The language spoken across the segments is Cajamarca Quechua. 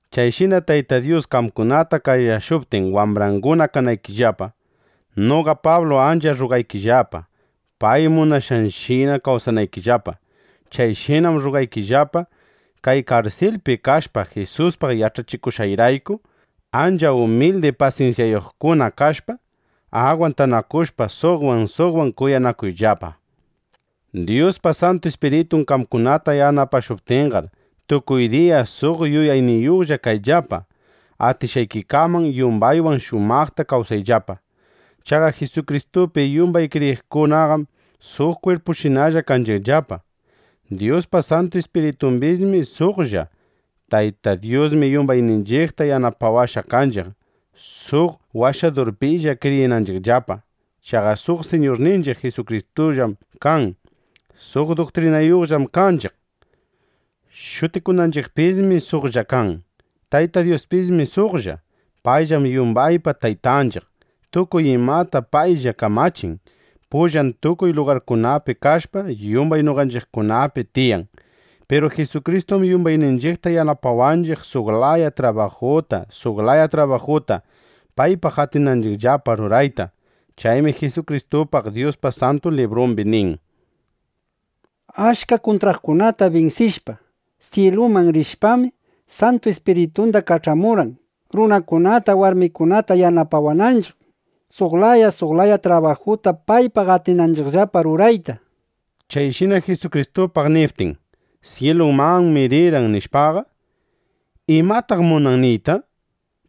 Chayshina Tayta Dyus qamkunata qayashuptin wambranguna kanaykillapa, noqa Pablu ancha rrugaykillapa, pay munashqanshina kawsanaykillapa. Chayshinam rrugaykillapa, kay karsilpi kashpa Jisuspaq yach'achikushqayrayku. Ancha umildi pasinsyayuqkuna kashpa, agwantanakushpa, suqwan, suqwan kuyanakuyllapa. Dyuspa Santu Ispiritun qamkunata yanapashuptinqar, tukuy diya suq yuyayniyuqlla kayllapa. Atishqaykikaman yumbaywan shumaqta kawsayllapa. Chaqa Jisukristupi yumbay kriyiqkunaqam suq kwirpushinalla kanchiqllapa. Dyuspa Santu Ispiritumbismi suqlla. Tayta Dyusmi yumbayninchiqta yanapawashqa kanchiq, suq Washadurpilla kriyinanchiqllapa. Chaqa suq Siñurninchiq Jisukristullam kan. Suq duktrinayuqllam kanchiq. Shutikunanchiqpismi suqlla kan. Tayta Dyuspismi suqlla. Payllam yumbaypa Taytanchiq. Tukuy imatam paylla kamachin. Payllam tukuy lugarkunapi kashpa, yumbay noqanchiqkunapi tiyan. Piru Jisukristum yumbayninchiqta yanapawanchiq, suq laya trabajuta, suq laya trabajuta paypaq atinanchiqllapa rurayta. Chaymi Jisukristupaq Dyuspa Santu Librumbi nin: Achka kuntraqkunata binsishpa, syiluman rishpam, Santu Ispiritunda kach'amurqan, runakunata warmikunata yanapawananchiq, suq laya suq laya trabajuta paypaq atinanchiqllapa rurayta, nishpa. Chayshina Jisukristupaq niptin: “Syilumanmi rirqan”, nishpaqa, ¿imataq munan niyta?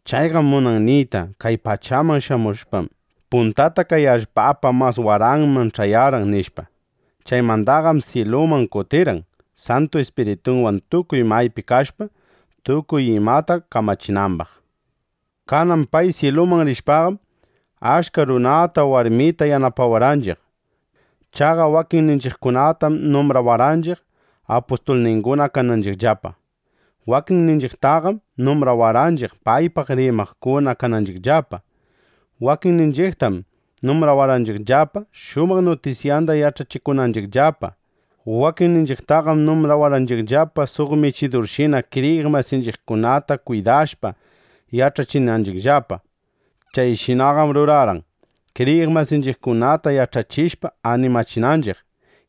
Chayqam munan niyta: Kay pachaman shamushpam, puntata kay allpapa mas waranman ch'ayarqan, nishpa. Chaymandaqam syiluman kutirirqan, Santu Ispiritunwan tukuy maypi kashpa, tukuy imata kamachinambaq. Kanan pay syiluman rishpaqam, achka runata, warmita yanapawarqanchiq. Chaqa wakinninchiqkunatam numbrawarqanchiq, apustulninguna kananchiqllapa. Wakinninchiqtaqam numbrawarqanchiq paypaq rimaqkuna kananchiqllapa. Wakinninchiqtaqam numbrawarqanchiqllapa, shumaq nutisyanda yach'achikunanchiqllapa. Wakinninchiqtaqam numbrawarqanchiqllapa, suq michidurshina kriyiq masinchiqkunata kwidashpa yach'achinanchiqllapa. Chayshinaqam rurarqan, kriyiq masinchiqkunata yach'achishpa, animachinanchiq,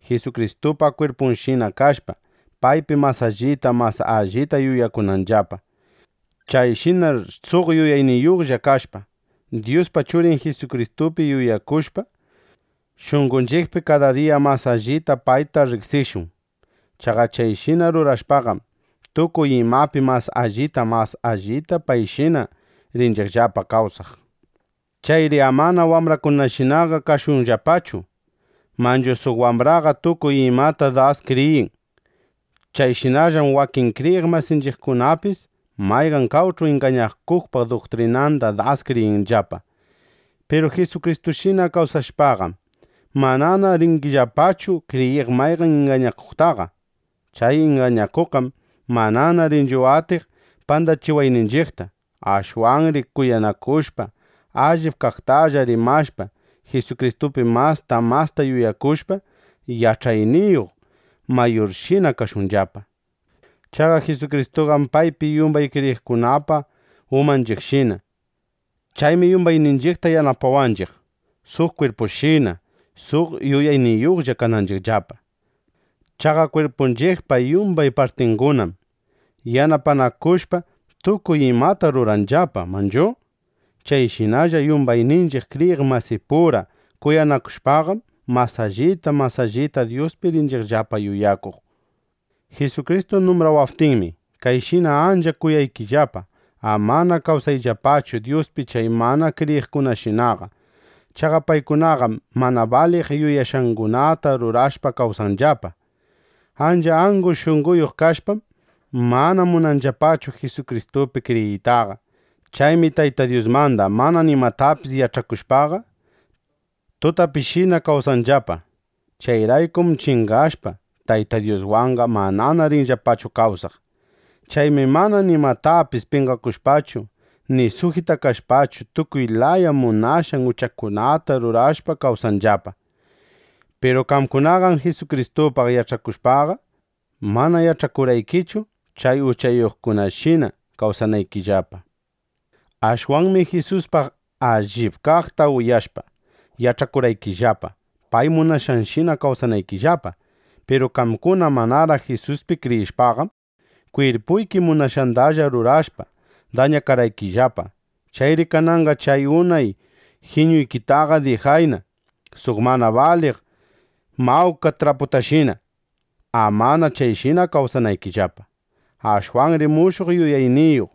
Jisukristupa kwirpunshina kashpa, paypi mas allita mas allita yuyakunanllapa. Chayshinar suq yuyayniyuqlla kashpa, Dyuspa Churin Jisukristupi yuyakushpa, shunqonchiqpi kada diya mas allita payta riqsishun. Chaqa chayshina rurashpaqam, tukuy imapi mas allita mas allita payshina rinchiqllapa kawsaq. Chayri amana wambrakunashinaqa kashunllapachu. Manchu suq wambraqa tukuy imata das kriyin. Chayshinallam wakin kriyiq masinchiqkunapis mayqan qawch'u ingañakuqpa duktrinanda das kriyinllapa. Piru Jisukristushina kawsashpaqam, manana rinchiqllapachu kriyiq mayqan ingañakuqtaqa. Chay ingañakuqqam manana rinchu atiq pandachiwayninchiqta. Ashwanri kuyanakushpa, allip kaqtalla rimashpa, Jisukristupi masta masta yuyakushpa, yach'ayniyuq mayurshina kashunllapa. Chaqa Jisukristuqam paypi yumbay kriyiqkunapa umanchiqshina. Chaymi yumbayninchiqta yanapawanchiq, suq kwirpushina, suq yuyayniyuqlla kananchiqllapa. Chaqa kwirpunchiqpa yumbay partingunaqam, yanapanakushpa, tukuy imata ruranllapa, ¿manachu? Chayshinalla yumbayninchiq kriyiq masipura kuyanakushpaqam, mas allita mas allita Dyuspi rinchiqllapa yuyakuq. Jisukristu numbrawaptinmi, kayshina ancha kunaykillapa: Amana kawsayllapachu Dyuspi chay mana kriyiqkunashinaqa. Chaqa paykunaqam mana baliq yuyashqangunata rurashpa kawsanllapa. Ancha angu shunqoyuq kashpam, mana munanllapachu Jisukristupi kriyiytaqa. Chaymi Tayta Dyusmanda mana nimatapis yach'akushpaqa, tutapishina kawsanllapa. Chayraykum chingashpa, Tayta Dyuswanqa manana rinllapachu kawsaq. Chaymi mana nimatapis penqakushpachu, ni sujitakashpachu, tukuy laya munashqan uchakunata rurashpa kawsanllapa. Piru qamkunaqam Jisukristupaq yach'akushpaqa, mana yach'akurqaykichu chay uchayuqkunashina kawsanaykillapa. Ashwanmi Jisuspaq allip kaqta uyashpa, yach'akurqaykillapa pay munashqanshina kawsanaykillapa. Piru qamkuna manaraq Jisuspi kriyishpaqam, kwirpuyki munashqandalla rurashpa, dañakarqaykillapa. Chayri kananqa chay unay jiñuykitaqa dijayna, suq mana baliq mawka lach'apatashina, amana chayshina kawsanaykillapa. Ashwanri mushuq yuyayniyuq,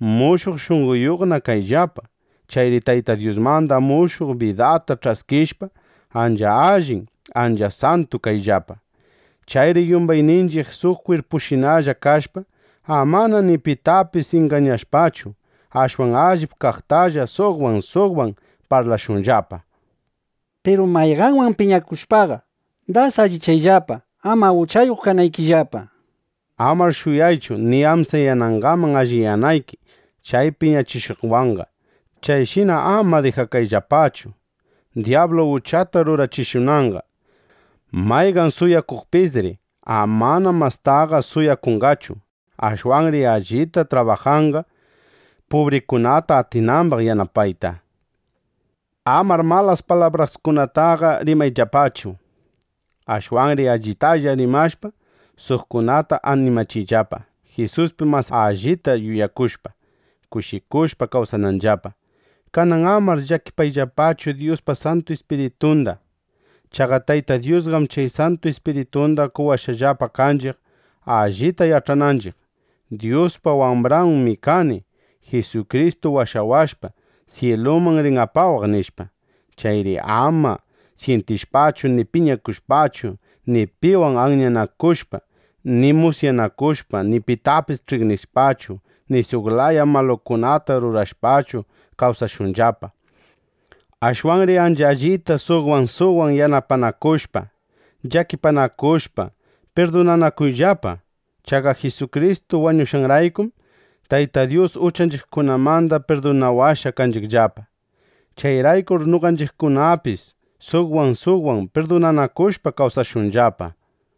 mushuq shunqoyuqna kayllapa. Chayri Tayta Dyusmanda mushuq bidata ch'askishpa, ancha allin, ancha santu kayllapa. Chayri yumbayninchiq suq kwirpushinalla kashpa, amana ni pitapis ingañashpachu, ashwan allip kaqtalla suqwan suqwan parlashunllapa. Piru mayqanwan piñakushpaqa, das alliyayllapa, ama uchayuq kanaykillapa. Amar shuyaychu ni amsayanangaman alliyanayki chay piñachishuqwanqa. Chayshina ama dijakayllapachu, dyablu uchata rurachishunanqa. Mayqan suwakuqpisri amana mastaqa suwakunqachu. Ashwanri allita trabajanqa, pubrikunata atinambaq yanapayta. Amar malas palabraskunataqa rimayllapachu. Ashwanri allitalla rimashpa, suqkunata animachiyllapa, Jisuspi mas allita yuyakushpa, kushikushpa kawsananllapa. Kanan amar llakichiyllapachu Dyuspa Santu Ispiritunda. Chaqa Tayta Dyusqam chay Santu Ispiritunda qowashqallapa kanchiq, allita yach'ananchiq: Dyuspa wambranmi kani. Jisukristu washawashpa, syiluman rin apawaq, nishpa. Chayri ama syintishpachu, ni piñakushpachu, ni piwan anyanakushpa, ni musyanakushpa, ni pitapis ch'iqnishpachu, ni suq laya malukunata rurashpachu, kawsashunllapa. Ashwanri ancha allita suqwan suqwan yanapanakushpa, llakipanakushpa, pirdunanakuyllapa. Chaqa Jisukristu wañushqanraykum, Tayta Dyus uchanchiqkunamanda pirdunawashqa kanchiqllapa. Chayraykur noqanchiqkunapis suqwan suqwan pirdunanakushpa kawsashunllapa.